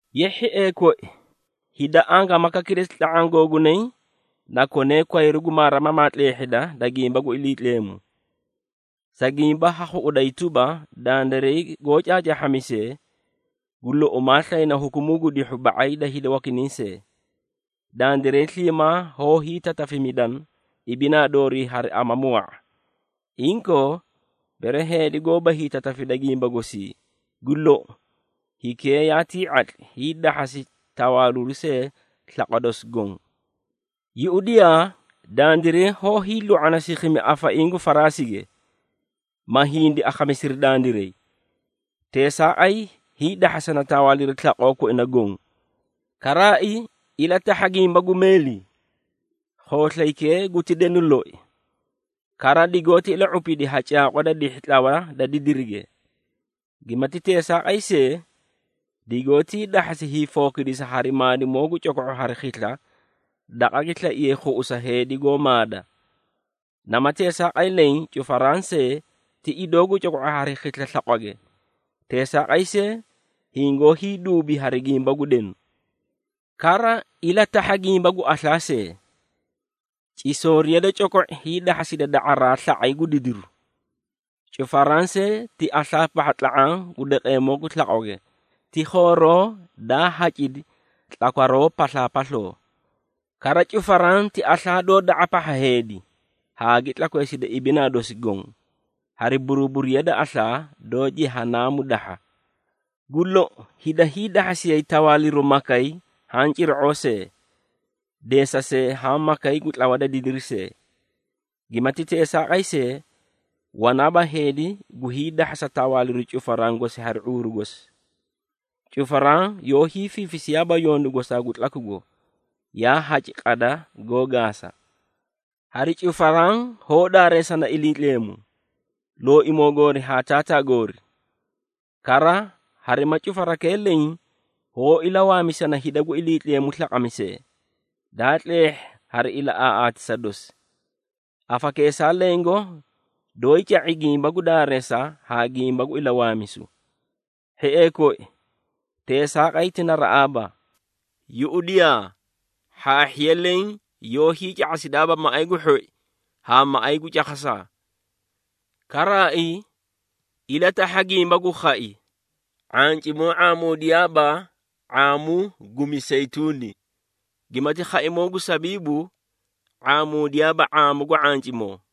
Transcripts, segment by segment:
Ye hhiee koi, hida angaamaka kilesi tla⁄aã googunay na konee kwayru gu maarimamaa tleehhida da gimba gu Iliitleemu, sa gimba ha khuꞌuday tuba, dandiray goó caacaahhamisee, gu lou, maa slayna hukumuu gu dihhu ba⁄ay da hida wakinay see. Dandiray sliimaa hoó hiitatafimidana ibinaa doorii hari amamu wa⁄a. Inkoo, bere heedi goóba hiitatafida gimba gosii, gu lou, hikee yaatii ⁄atli, hiidahhasi tawaaliru see slaqwa dosi goõ. Yuꞌudiyaa, dandiray hoó hiilu⁄ana sikhimi afaiĩ gu faraasige, ma hindi akhamisiri dandiray, teesaaqay hiidahhasana tawaaliru slaqoo koina goõ. Karaai, ilatahha gimba gu meeli: khooslaykee guti denu loi, kara digoóti ila⁄upidi ha caaqwa da dihhi tlawa da didirige. Gimati teesaaqay see, digoótii dahhasi hiifookidisa hari maadimoo gu coko⁄u hari khisla daqa gi slaiye khuꞌusa heedi goó maada. Nama teesaaqay leẽ, cufaraã see ti idoo gu coko⁄u hari khisla slaqwage, teesaaqay see, hingoó hiiduubi hari gimba gu denu. Kara, ilatahha gimba gu aslaa see: cisooriya da coko⁄i hiidahhasida da⁄araa sla⁄ay gu didiru. Cufaraã see ti aslaa pahha tla⁄aã gu daqeemoo gu slaqwage, ti khooroo daa hacidi tlakwaroo paslaapasloo. Kara, cufaraã ti aslaa doó da⁄a pahha heedi haa gi tlakweesida ibinaa dosi goõ, hari buruburiya da aslaa doó Jehanaamu dahha. Gu lou, hida hiidahhasiyay tawaaliru makay haã cira⁄oo see, deesasee haã makay gu tlawa da didiri see. Gimati teesaaqay see, wanaaba heedi gu hiidahhasa tawaaliru cufaraã gosi hari ⁄uuru gosi. Cufaraã yoó hiifiifisiyaaba yondu gosaa gu tlakugo, yaa haci qada goó gaasa. Hari cufaraã hoó daareesana Iliitleemu, Looimoo goori haa Taataa goori. Kara harima cufarakee leẽ hoó ilawaamisana hida gu Iliitleemu slaqamisee, daa tleehhi hari ilaꞌaaꞌatisa dosi. Afakeesaa lengo doóyii ca⁄i gimba gu daareesa haa gimba gu ilawaamisu. Hhiee koi, teesaaqay ti naraꞌaaba. Yuꞌudiyaa, hhaahhiya leẽ yoó hiica⁄asidaaba maꞌay gu hhoi haa maꞌay gu cakhasaa. Karaai, ilatahha gimba gu khai: ⁄ancimoo ⁄aamuudiyaaba ⁄aamu gu miseyituuni, gimati khaimoo gu sabiibu ⁄aamuudiyaaba ⁄aamu gu ⁄ancimoo.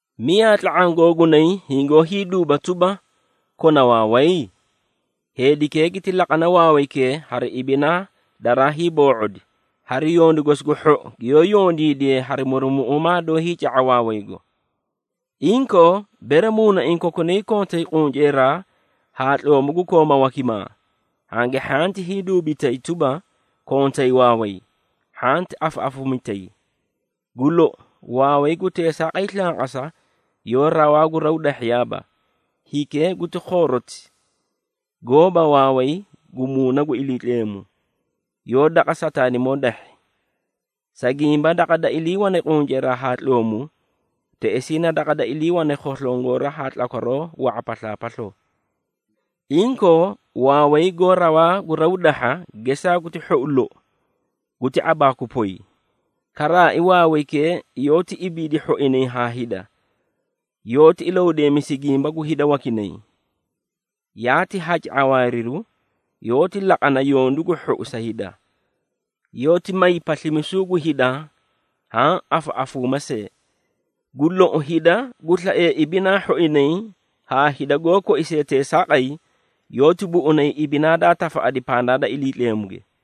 Miyaa tla⁄aã googunay hingoó hiiduuba tuba, kona waaway? Heedikee giti laqane waawaykee hari ibinaa daraa hiiboo⁄odi, hari yondu gosi gu hhou, giyoó yondiidiye hari murumuꞌuumaa, doó hiica⁄a waawaygo. Inkoo, bere muunaiĩ kokunay kontay qunceeraa haa tloomu gu kooma wakimaa, hangi hhanti hiiduubitay tuba, kontay waaway, hhanti afaꞌafuumitayi. Gu lou, waaway gu teesaaqay slanqasa yoó rawaa gu raw dahhiyaaba, hikee guti khooroti, goóba waaway gu Muuna gu Iliitleemu, yoó daqa Sataanimoo dahhi. Sa gimba daqa da iliiwane qunceeraa haa tloomu, teꞌesii na daqa da iliiwane khoslongora haa tlakwaroo wa⁄a paslaapasloo. Inkoo, waaway goó rawaa gu raw dahha, gesaa guti hhou loi, guti ⁄abaaku poy. Karaai, waawaykee yoóti ibiidi hhoinay haa hida, yoóti ilahudeemisi gimba gu hida wakinay. Yaati haci ⁄awaariru, yoóti laqana yondu gu hhou sa hida. Yoóti may paslimisuu gu hida haã afaꞌafuumaa see. Gu lou, hida gu slaee ibinaa hhoinay haa hida, goó koisee teesaaqay, yoóti buꞌunay ibinaa daa tafaꞌadi pandaa da Iliitleemuge.